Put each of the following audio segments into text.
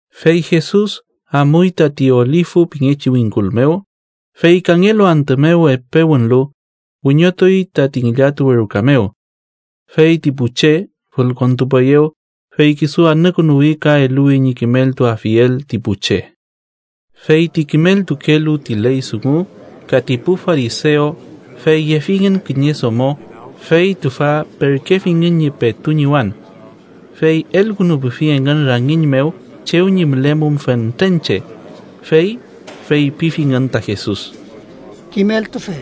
Fey Jesus amuy tati Olifu pingechi wingkul mew, fey kangelu antü mew epe wünlu, wiñotuy tati ngillatuwe ruka mew. Fey ti pu che fülkontupueyew, fey kisu anükünuwi ka eluwi ñi kimeltuafiel ti pu che. Fey ti kimeltukelu ti ley dungu ka ti pu farisew fey yefingün kiñe domo fey tüfa perkefingün ñi petu ñiwan. Fey elkünupufi engün rangiñ mew chew ñi mülemum fentren che. Fey feypifingün ta Jesus: —Kimeltufe,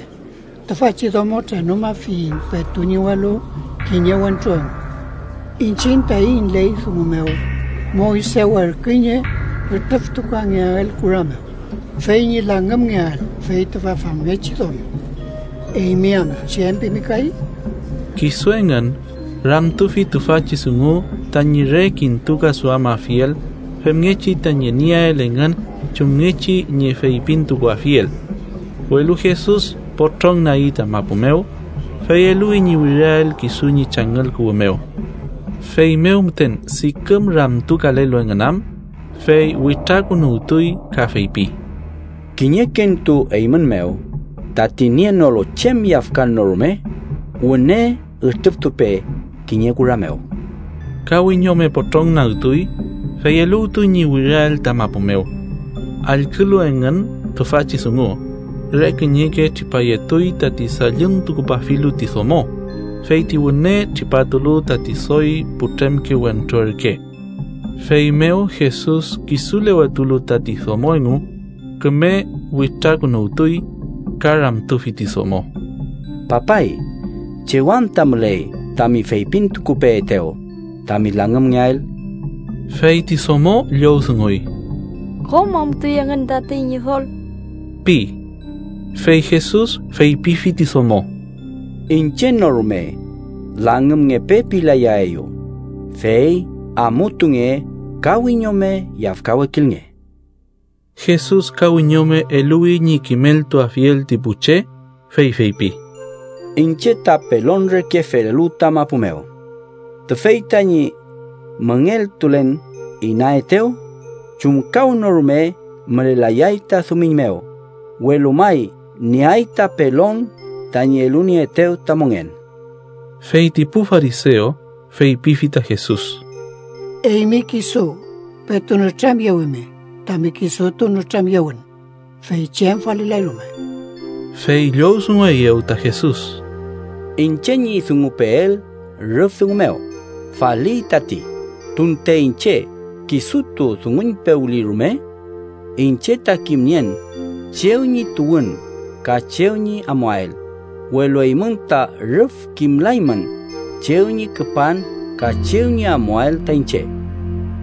tüfachi domo trenumafiyiñ petu ñiwalu kiñe wentru engu. Iñchiñ taiñ ley dungu mew, Moyse werküy ñi ütrüftukangeael kura mew, fey ñi langümngeael fey tüfa famngechi domo. ¿Eymi am, chem pimi kay? Kisu engün ramtufi tüfachi dungu tañi re kintukaduamafiel femngechi tañi nieael engün chumngechi ñi feypintukuafiel. Welu Jesus potrongnagi ta mapu mew, fey eluwi ñi wiriael kisu ñi changüll kuwü mew. Feymew müten diküm ramtukalelu engün am, fey witrakünuwtuy ka feypi: —Kiñekentu eymün mew tati nienolu chem yafkan no rume, wüne ütrüftupe kiñe kura mew. Ka wiñome potrongnagtuy fey eluwtuy ñi wiriael ta mapu mew. Allkülu engün tüfachi dungu, re kiñeke tripayetuy tati dalluntukupafilu ti domo, fey ti wüne tripatulu tati doy putremke wentru ürke. Feymew Jesus kisulewetulu tati domo engu, küme witrakünuwtuy ka ramtufi ti domo: —Papay, ¿chew anta müley tami feypintukupeetew tami langümngeael? Fey ti domo llowdunguy: —Kom amutuy engün tatey, Ñidol ―pi. Fey Jesus feypifi ti domo: —Iñche no rume ‘langümngepe’ pilayaeyu, fey amutunge ka wiñome yafkawekilnge.) Jesus ka wiñome eluwi ñi kimeltuafiel ti pu che, fey feypi: —Iñche ta pelon reke felelu ta mapu mew. Tüfey tañi müngeltulen inaetew chumkawnorume mülelayay ta dumiñ mew, welu may nieay ta pelon tañi elunieetew ta mongen. Fey ti pu farisew feypifi ta Jesus: —Eymi kisu petu nütramyewimi tami kisutu nütramyewün, fey chem falilay rume. Fey llowdungueyew ta Jesus: —Iñche ñi dungupeel rüf dungu mew faliy tati, tunte iñche kisutu dunguñpewli rume. Iñche ta kimnien chew ñi tuwün ka chew ñi amuael, welu eymün ta rüf kimlaymün chew ñi küpan ka chew ñi amuael ta iñche.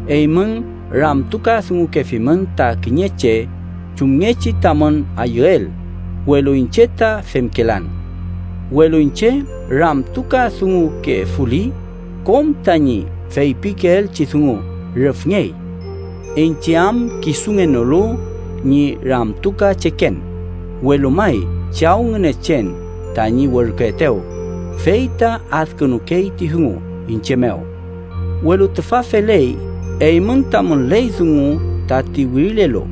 Eymün ramtukadungukefimün ta kiñe che chumngechi tamün ayüel, welu iñche ta femkelan. Welu iñche ramtukadungukefuli, kom tañi feypikeelchi dungu rüfngey. Iñche am kisungenolu ñi ramtukacheken, welu may Chaw Ngünechen tañi werküetew, fey ta adkünukey ti dungu iñche mew. Welu tüfa feley eymün tamün ley dungu tati wirilelu,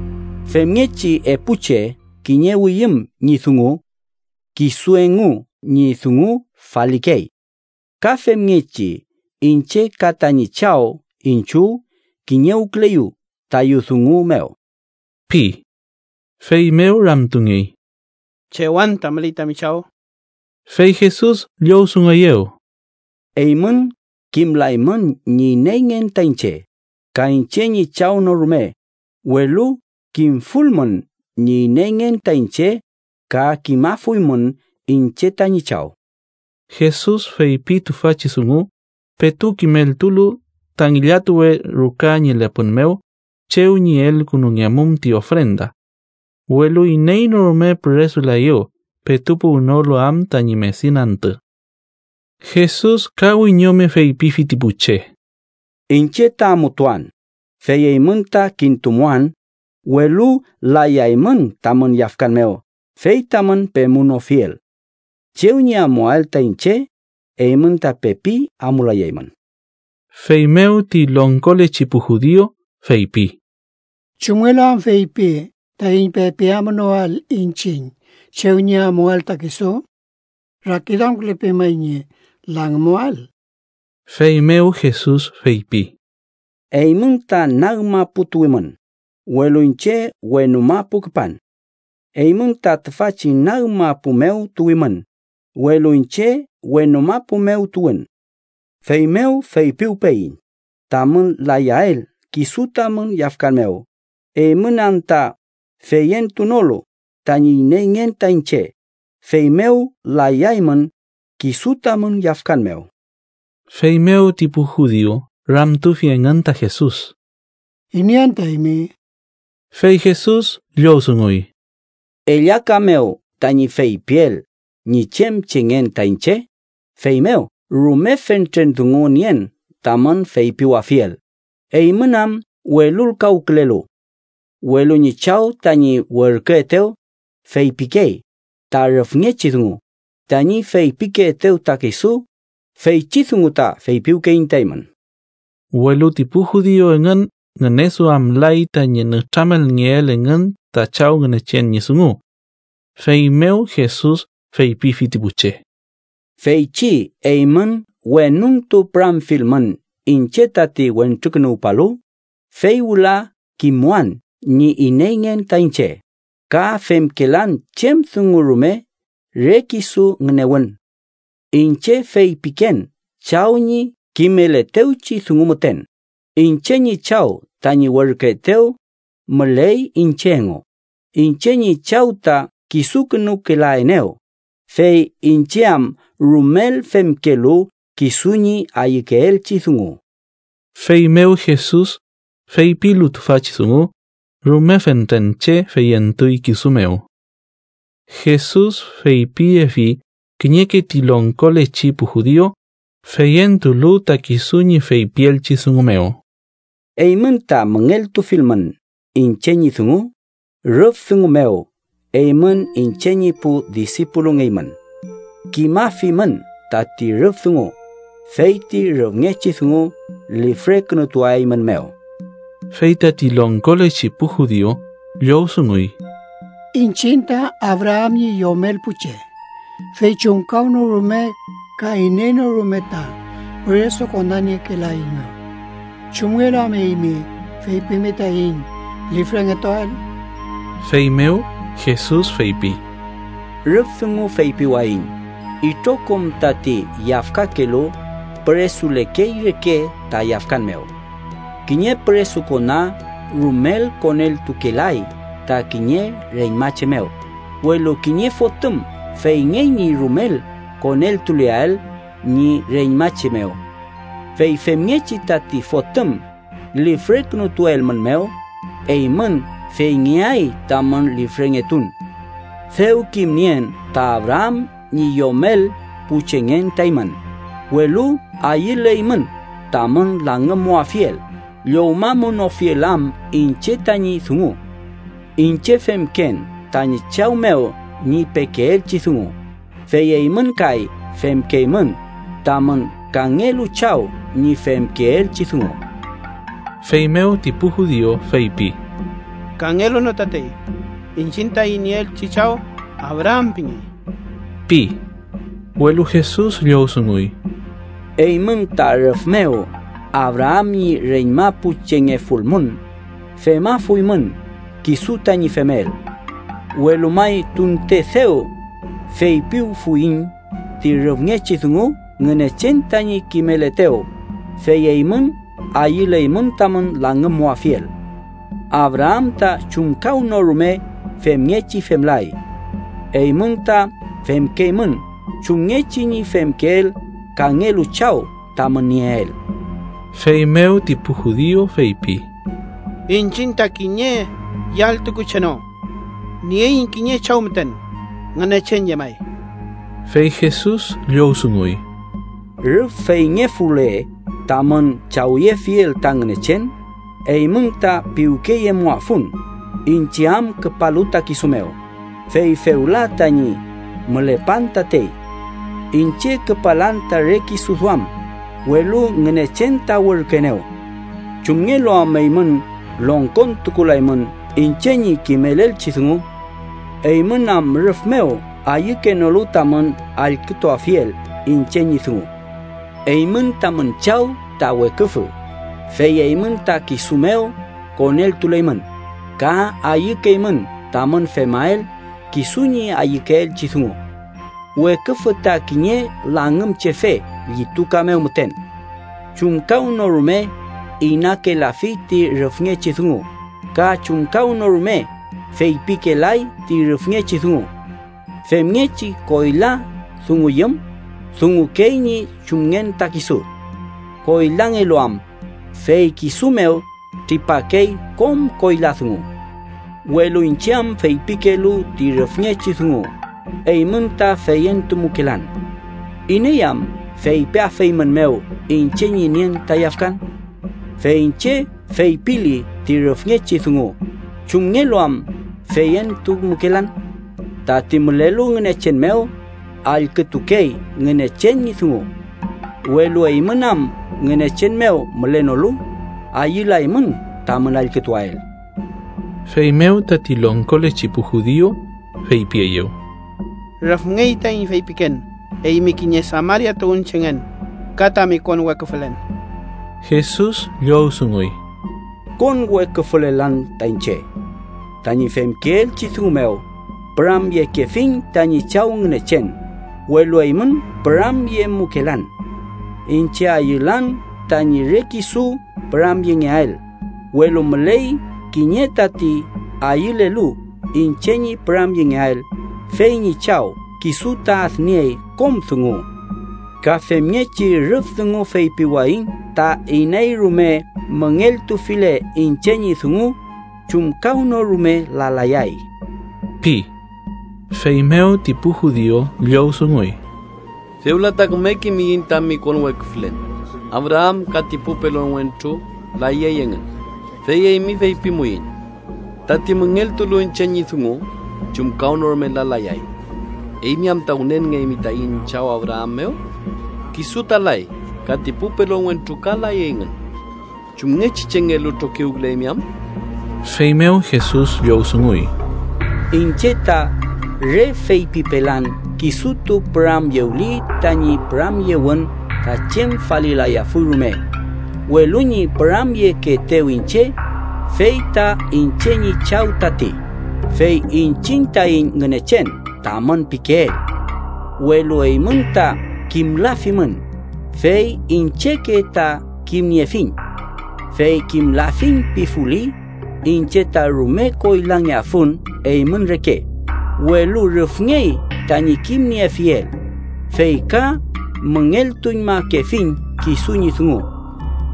femngechi epu che kiñewiyüm ñi dungu, kisu engu ñi dungu falikey. Ka femngechi, iñche ka tañi Chaw iñchiw kiñewküleyu tayu dungu mew ―pi. Feymew ramtungey: —¿Chew anta müley tami chaw? Fey Jesus llowdungueyew: —Eymün kimlaymün ñi ineyngen ta iñche, ka iñche ñi Chaw no rume, welu kimfulmün ñi ineyngen ta iñche, ka kimafuymün iñche tañi Chaw. Jesus feypi tüfachi dungu petu kimeltulu ta ngillatuwe ruka ñi lepün mew chew ñi elngekemum ti ofrenda. Welu iney no rume püresulaeyew, petu puwnolu am tañi medin antü. Jesus ka wiñome feypifi ti pu che: —Iñche ta amutuan, fey eymün ta kintumuan, welu layaymün tamün yafkan mew fey tamün pemunofiel. Chew ñi amuael ta iñche, eymün ta pepi amulayaymün. Feymew ti longkolechi pu judiu feypi: —¿Chumngelu am feypi taiñ pepi amunoael iñchiñ chew ñi amuael ta kisu? ¿Rakiduamkülepey may ñi kisu langümuwael? Feymew Jesus feypi: —Eymün ta nag mapu tuwimün, welu iñche wenu mapu küpan. Eymün ta tüfachi nag mapu mew tuwimün, welu iñche wenu mapu mew tuwün. Feymew feypiwpeyiñ tamün layael kisu tamün yafkan mew, eymün am ta feyentunolu tañi ineyngen ta iñche, feymew layaymün kisu tamün yafkan mew. Feymew ti pu judiu ramtufi engün ta Jesus: —¿Iney anta eymi? Fey Jesus llowdunguy: —Ellaka mew tañi feypiel ñi chem chengen ta iñche, feymew rume fentren dungu nien tamün feypiwafiel eymün am welulkawkülelu. Welu ñi Chaw tañi werküetew feypikey ta rüfngechi dungu, tañi feypikeetew ta kisu, feychi dungu ta feypiwkeyiñ ta eymün. Welu ti pu judiu engün ngüneduamlay tañi nütramelngeel engün ta Chaw Ngünechen ñi dungu. Feymew Jesus feypifi ti pu che: —Feychi eymün wenuntu püramfilmün iñche tati Wentrukünuwpalu, fey wüla kimmuan ñi ineyngen ta iñche, ka femkelan chem dungu rume re kisu ngünewün. Iñche feypiken Chaw ñi kimeletewchi dungu müten. Iñche ñi Chaw tañi werküetew müley iñche engu, iñche ñi Chaw ta kisukünukelaenew, fey iñche am rumel femkelu kisu ñi ayükeelchi dungu. Feymew Jesus, feypilu tüfachi dungu, rume fentren che feyentuy kisu mew. Jesus feypiyefi kiñeke ti longkolechi pu judiu feyentulu ta kisu ñi feypielchi dungu mew: —Eymün ta müngeltufilmün iñche ñi dungu, rüf dungu mew eymün iñche ñi pu disipulungeymün. Kimafimün tati rüf dungu, fey ti rüfngechi dungu lifrekünutuaeymünmew. Fey tati longkolechi pu judiu llowdunguy: —Iñchiñ ta Abraam ñi yomel pu che, fey chumkawnorume ka iney no rume ta püresukonaniekelaeiñmew. ¿Chumngelu am eymi feypimi taiñ lifrengetuael? Feymew Jesus feypi: —Rüf dungu feypiwayiñ itrokom tati yafkakelu püresulekey reke ta yafkan mew. Kiñe püresukona rumel koneltukelay ta kiñe reñmache mew, welu kiñe fotüm feyngey ñi rumel koneltuleael ñi reñmache mew. Fey femngechi, tati fotüm lifrekünutuelmünmew, eymün feyngeay tamün lifrengetun. Dew kimnien ta Abraam ñi yomel pu chengen ta eymün, welu ayüleymün tamün langümmuafiel llowmamunofiel am iñche tañi dungu. Iñche femken tañi Chaw mew ñi pekeelchi dungu, fey eymün kay femkeymün tamün kangelu chaw ñi femkeelchi dungu. Feymew ti pu judiu feypi: —¡Kangelu no tatey! ¡Iñchiñ taiñ nieelchi chaw Abraam pingey! ―pi. Welu Jesus llowdunguy: —Eymün ta rüf mew Abraam ñi reñma pu chengefulmün, femafuymün kisu tañi femel. Welu may tunte dew feypiwfuyiñ ti rüfngechi dungu Ngünechen tañi kimeletew, fey eymün ayüleymün tamün langümmuafiel. ¡Abraam ta chumkawnorume femngechi femlay! Eymün ta femkeymün chumngechi ñi femkeel kangelu chaw tamün nieel. Feymew ti pu judiu feypi: —¡Iñchiñ ta kiñe yalltuku che no! Nieiñ kiñe chaw müten, Ngünechen llemay. Fey Jesus llowdunguy: —Rüf feyngefule tamün chawyefiel ta Ngünechen, eymün ta piwkeyemuafun, iñche am küpalu ta kisu mew, fey fewla tañi mülepan tatey. Iñche küpalan ta re kisu duam, welu Ngünechen ta werküenew. ¿Chumngelu am eymün longkontukulaymün iñche ñi kimelelchi dungu? Eymün am rüf mew ayükenolu tamün allkütuafiel iñche ñi dungu. Eymün tamün chaw ta weküfü, fey eymün ta kisu mew koneltuleymün, ka ayükeymün tamün femael kisu ñi ayükeelchi dungu. Weküfü ta kiñe langümchefe llituka mew müten. Chumkawnorume inakelafi ti rüfngechi dungu, ka chumkawnorume feypikelay ti rüfngechi dungu. Femngechi koyla dunguyüm, dungukey ñi chumngen ta kisu. Koylangelu am, fey kisu mew tripakey kom koyla dungu. Welu iñche am feypikelu ti rüfngechi dungu, eymün ta feyentumukelan. ¿Iney am feypiafeymünmew iñche ñi nien ta yafkan? Fey iñche feypili ti rüfngechi dungu, ¿chumngelu am feyentumukelan? Tati mülelu Ngünechen mew, allkütukey Ngünechen ñi dungu. Welu eymün am Ngünechen mew mülenolu, ayülaymün tamün allkütuael. Feymew tati longkolechi pu judiu feypieyew: —Rüfngey taiñ feypiken eymi kiñe Samaria tuwünchengen ka tami konweküfülen. Jesus llowdunguy: —Konweküfülelan ta iñche. Tañi femkeelchi dungu mew püramyekefiñ tañi Chaw Ngünechen, welu eymün püramyemukelan. Iñche ayülan tañi re kisu püramyengeael, welu müley kiñe tati ayülelu iñche ñi püramyengeael, fey ñi Chaw kisu ta adniey kom dungu. Ka femngechi rüf dungu feypiwayiñ ta iney rume müngeltufile iñche ñi dungu, chumkawnorume lalayay ―pi. Feymew ti pu judiu llowdunguy: —Fewla ta küme kimiyiñ tami konweküfülen. Abraam ka ti pu pelon wentru layey engün, fey eymi feypimupeiñ: ‘Tati müngeltulu iñche ñi dungu, chumkawnorume lalayay.’ ¿Eymi anta wünenngeymi taiñ chaw Abraam mew? Kisu ta lay, ka ti pu pelon wentru ka layey engün. ¿Chumngechi chengelu trokiwküleymi am? Feymew Jesus llowdunguy: —Iñche ta re feypipelan kisutu püramyewli, tañi püramyewün ta chem falilayafuy rume, welu ñi püramyekeetew iñche, fey ta iñche ñi Chaw tati, fey iñchiñ taiñ Ngünechen tamün pikeel. Welu eymün ta kimlafimün, fey iñcheke ta kimniefiñ. Fey kimlafiñ pifuli, iñche ta rume koylangeafun eymün reke. Welu rüfngey tañi kimniefiel, fey ka müngeltuñmakefiñ kisu ñi dungu.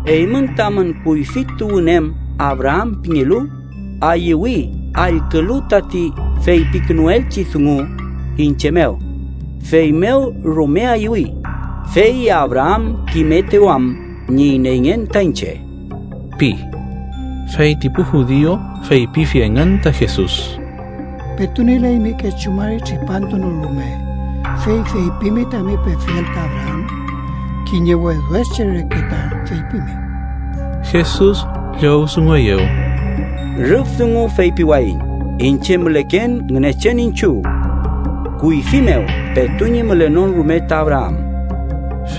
Eymün tamün kuyfi tuwün em Abraam pingelu, ayüwi allkülu tati feypikünuelchi dungu iñche mew, feymew rume ayüwi, fey Abraam kimetew am ñi ineyngen ta iñche ―pi. Fey ti pu judiu feypifi engün ta Jesus: —Petu nielaymi kechu mari tripantu no rume, ¿fey feypimi tami pefiel ta Abraam? Kiñe wedwed che reke ta feypimi. Jesus llowdungueyew: —Rüf dungu feypiwayiñ iñche müleken Ngünechen iñchiw kuyfi mew petu ñi mülenon rume ta Abraam.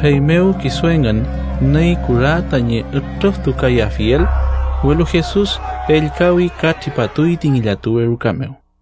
Feymew kisu engün nüy kura tañi ütrüftukayafiel, welu Jesus ellkawi ka tripatuy ti ngillatuwe ruka.